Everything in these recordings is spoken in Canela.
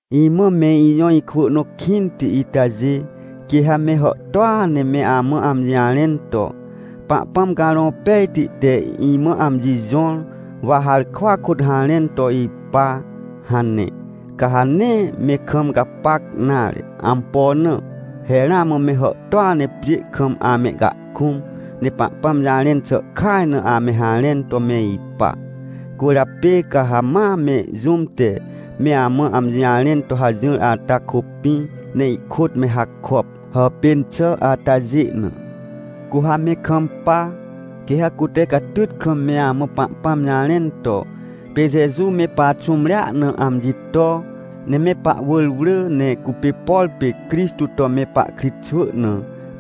Imã me ijõ ikwỳ nõ kĩnti itajê, quê ha me hàhtôa ne me amã amji jarẽn to: — Pahpãm Carõ Pejti te imã amji jõr, wa harkwa kôt harẽn to ipa — hane. Ca ha nee me kam gapac nare. Ampo na? He ramã me hàhtôa ne pjê kam amehcahkũm, ne Pahpãm jarẽn xà kaj na ame harẽn to me ipa. Cwỳrjapê ca ha ma me jũm te me amã amji jarẽn to hajỹr ata kôpĩ, ne ihkôt me hakop, hàpên xà atajê na. Cu ha me kampa, quê ha cute catyt kam me amã Pahpãm jarẽn to: — Pê Jeju me paxũmrea na amji to, ne me pahwỳr wrỳ, ne cupê, por pê Crixtô to me pahkritxwỳ na,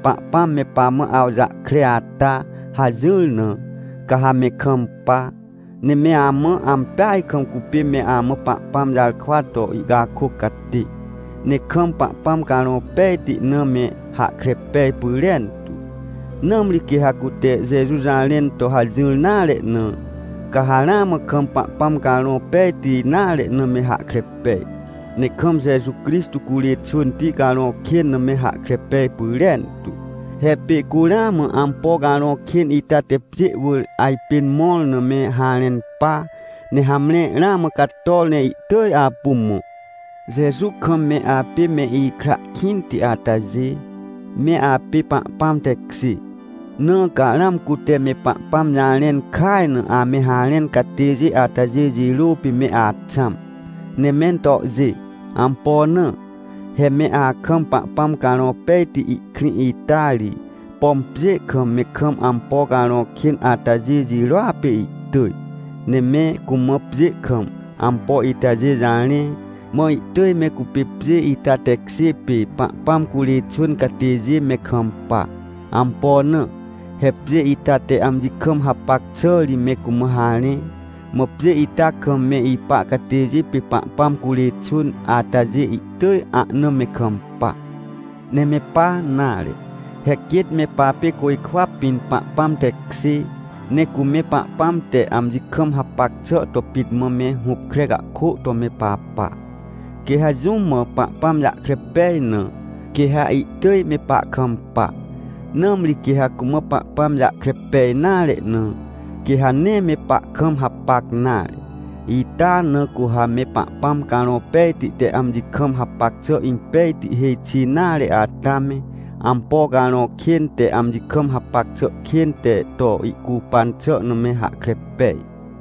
Pahpãm me pamã awjahkre ata — hajỹr na, ca ha me kampa. Ne me amã ampeaj kam cupê me amã Pahpãm jarkwa to ihcakôc catê, ne kam Pahpãm Carõ Pejti na me hahkre pej pyrentu. Nãmri quê ha cute Jeju jarẽn to hajỹr nare na, ca ha ramã kam Pahpãm Carõ Pejti nare na me hahkre pej, ne kam Jeju Crixtô curê xwỳnti carõ kên na me hahkre pej pyrentu. He pê cu ramã ampo carõ kên ita te pjê wỳr ajpên mõr na me harẽn pa, ne hamre, ramã cator ne ihtỳj apu mõ. Jeju kam me apê me ikra kĩnti atajê, me apê Pahpãm tekjê, na ca ramã cute me Pahpãm jarẽn kaj na ame harẽn catêjê atajê jirô pê me axãm, ne me tohjê. Ampo na? He me akam Pahpãm Carõ Pejti ihkrĩ ita ri, pom pjê kam me kam ampo carõ kên atajê jirôa pê ihtỳj. Ne me cumã pjê kam ampo itajê jarẽ, mã ihtỳj me cupê pjê ita tekjê pê Pahpãm curê xwỳn catêjê me kampa. Ampo na? He pjê ita te amji kam hapac xà ri me cumã harẽ, mã pjê ita kam me ipa catêjê pê Pahpãm curê xwỳn atajê ihtỳj ahna me kampa. Ne me pa nare, he quêt me papê côjkwa pĩn Pahpãm tekjê, ne cu me Pahpãm te amji kam hapac xà to pit mã me hupkre cahkô to me papa. Quê ha jũm mã Pahpãm jahkre pej na, quê ha ihtỳj me pahkampa. Nãmri quê ha cumã Pahpãm jahkre pej nare na, quê ha nee me pahkam hapac nare. Ita na cu ha me Pahpãm Carõ Pejti te amji kam hapac xà impejti hêj xi nare ata me, ampo carõ kên te amji kam hapac xà kên te to ihcupan xà na me hahkre pej.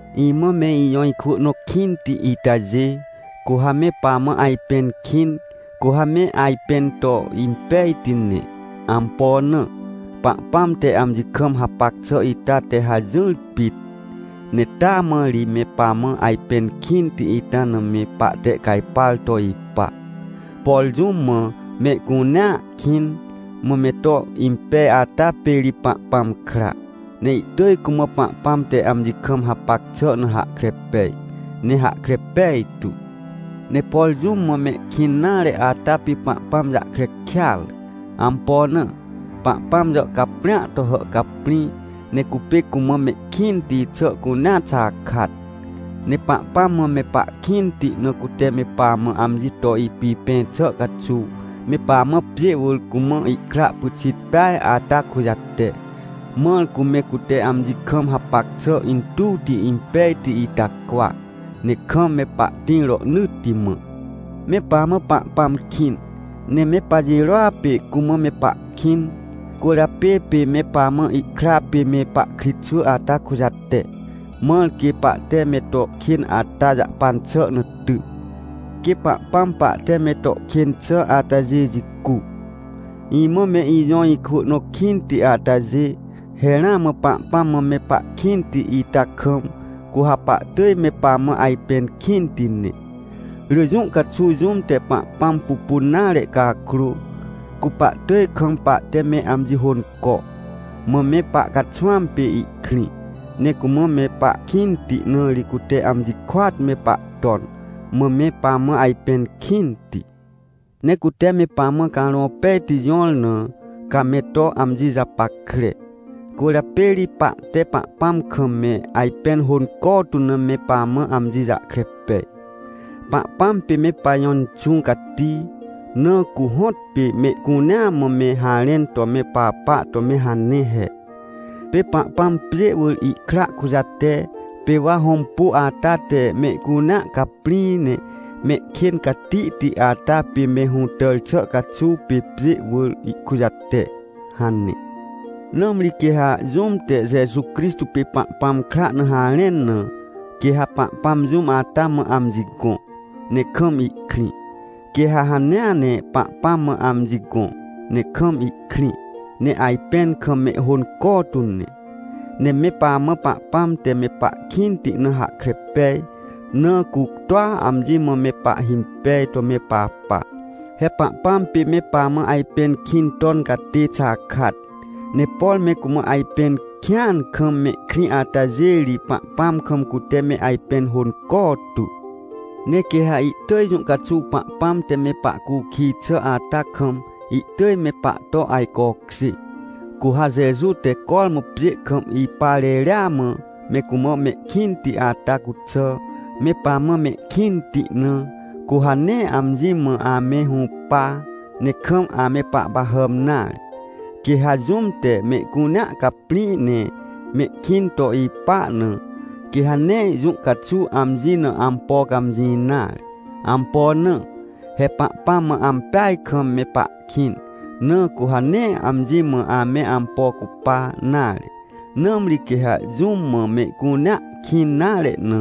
Imã me ijõ ikwỳ nõ kĩnti itajê, cu ha me pamã ajpẽn kĩn, cu ha me ajpẽn to impejti ne. Ampo na? Pahpãm te amji kam hapac xà ita te hajỹr pit, ne taa mã ri me pamã ajpẽn kĩnti ita na me pahtehcajpar to ipa. Por jũm mã mehcunea kĩn, mã me to impej ata pê ri Pahpãm kra, ne ihtỳj cumã Pahpãm te amji kam hapac xà na hahkre pej ne hahkre pejtu. Ne por jũm mã mehkĩn nare ata pê Pahpãm jahkre kêatre. Ampo na? Pahpãm jàhcaprĩa to hàhcaprĩ, ne cupê cumã mehkĩnti xà cunea xakat. Ne Pahpãm mã me pahkĩnti na cute me pamã amji to ipipẽ xà caxuw, me pamã pjê wỳr cumã ihkra pyxit peaj ata kujate, mãr cu me cute amji kam hapac xà intuwti impejti ita cwa, ne kam me pahtĩr rohnỳtti mã. Me pamã Pahpãm kĩn, ne me pajirôa pê cumã me pahkĩn. Cwỳrjapê pê me pamã ihkra pê me pahkritxwỳ ata kujate, mãr quê pahte me to kên ata jahpan xà na ty, quê Pahpãm pahte me to kên xà atajê jicu. Imã me ijõ ikwỳ nõ kĩnti atajê, he ramã Pahpãm mã me pahkĩnti ita kam, cu ha pahtỳj me pamã ajpẽn kĩnti ne. Rỳ jũ caxuw jũm te Pahpãm pupun nare cakrô, cu pahtỳj kam pahte me amji hônco. Mã me pahcaxwãm pê ihkrĩ, ne cumã me pahkĩnti na ri cute amji kôat me pahton, mã me pamã ajpẽn kĩnti. Ne cute me pamã Carõ Pejti jõr na, ca me to amji japackre. Cwỳrjapê ri pahte Pahpãm kam me ajpẽn hônco tu na me pamã amji jahkre pej. Pahpãm pê me pajõ Inxũ Cati, na cu hõtpê mehcunea mã me harẽn to me papa to me hane he: — Pê Pahpãm pjê wỳr ihkra kujate. Pê wa hõmpu ata te mehcunea caprĩ ne mehkên catihti ata pê me hũtàr xà caxuw pê pjê wỳr ihkujate — hane. Nãmri quê ha jũm te Jeju Crixtô pê Pahpãm kra na harẽn na, quê ha Pahpãm jũm ata mã amji gõ, ne kam ihkrĩ, quê ha hanea ne Pahpãm mã amji gõ, ne kam ihkrĩ, ne ajpẽn kam mehhônco tu ne. Ne me pamã Pahpãm te me pahkĩnti na hahkre pej, na cu toa amji mã me pahhimpej to me papa. He Pahpãm pê me pamã ajpẽn kĩn ton catê xakat. Ne por me cumã ajpẽn kĩan kam mehkrĩ atajê ri, Pahpãm kam cute me ajpẽn hônco tu. Ne quê ha ihtỳj jũ caxuw Pahpãm te me pahcukij xà ata kam ihtỳj me pahto ajcokjê. Cu ha Jeju te cormã pjê kam ipa reria mã me cumã mehkĩnti ata cuxà, me pamã mehkĩnti na, cu ha nee amji mã ame hũpa, ne kam ame pahpahàm nare. Quê ha jũm te mehcunea caprĩ ne mehkĩn to ipa na, quê ha nee jũ caxuw amji na ampo cãmjĩ nare. Ampo na? He Pahpãm mã ampeaj kam me pahkĩn, na cu ha nee amji mã ame ampo cupa nare. Nãmri quê ha jũm mã mehcunea kĩn nare na,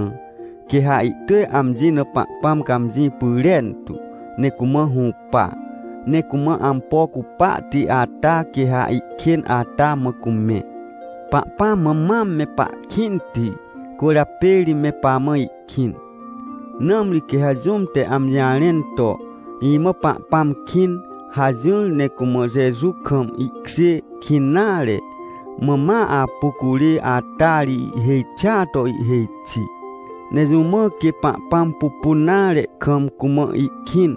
quê ha ihtỳj amji na Pahpãm cãmjĩ pyrentu, ne cumã hũpa. Ne cumã ampo cupahti ata quê ha ihkên ata mã cumẽ. Pahpãm mã mam me pahkĩnti, cwỳrjapê ri me pamã ihkĩn. Nãmri quê ha jũm te amji jarẽn to: — Imã Pahpãm kĩn — hajỹr, ne cumã Jeju kam ihkjê kĩn nare, mã ma apu curê, ata ri ihhêj xia to ihhêj xi. Ne jũ mã quê Pahpãm pupun nare kam cumã ihkĩn,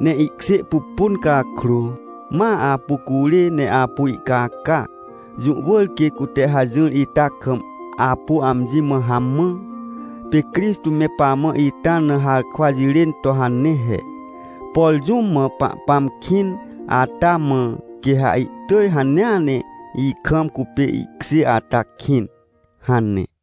ne ihkjê pupun cakrô, ma apu curê ne apu ihcaca? Jũ wỳr quê cute hajỹr ita kam apu amji mã hamã. Pê Crixtô me pamã ita na harkwa jirên to hane he: — Por jũm mã Pahpãm kĩn ata mã, quê ha ihtỳj hanea ne ikam cupê ihkjê ata kĩn — hane.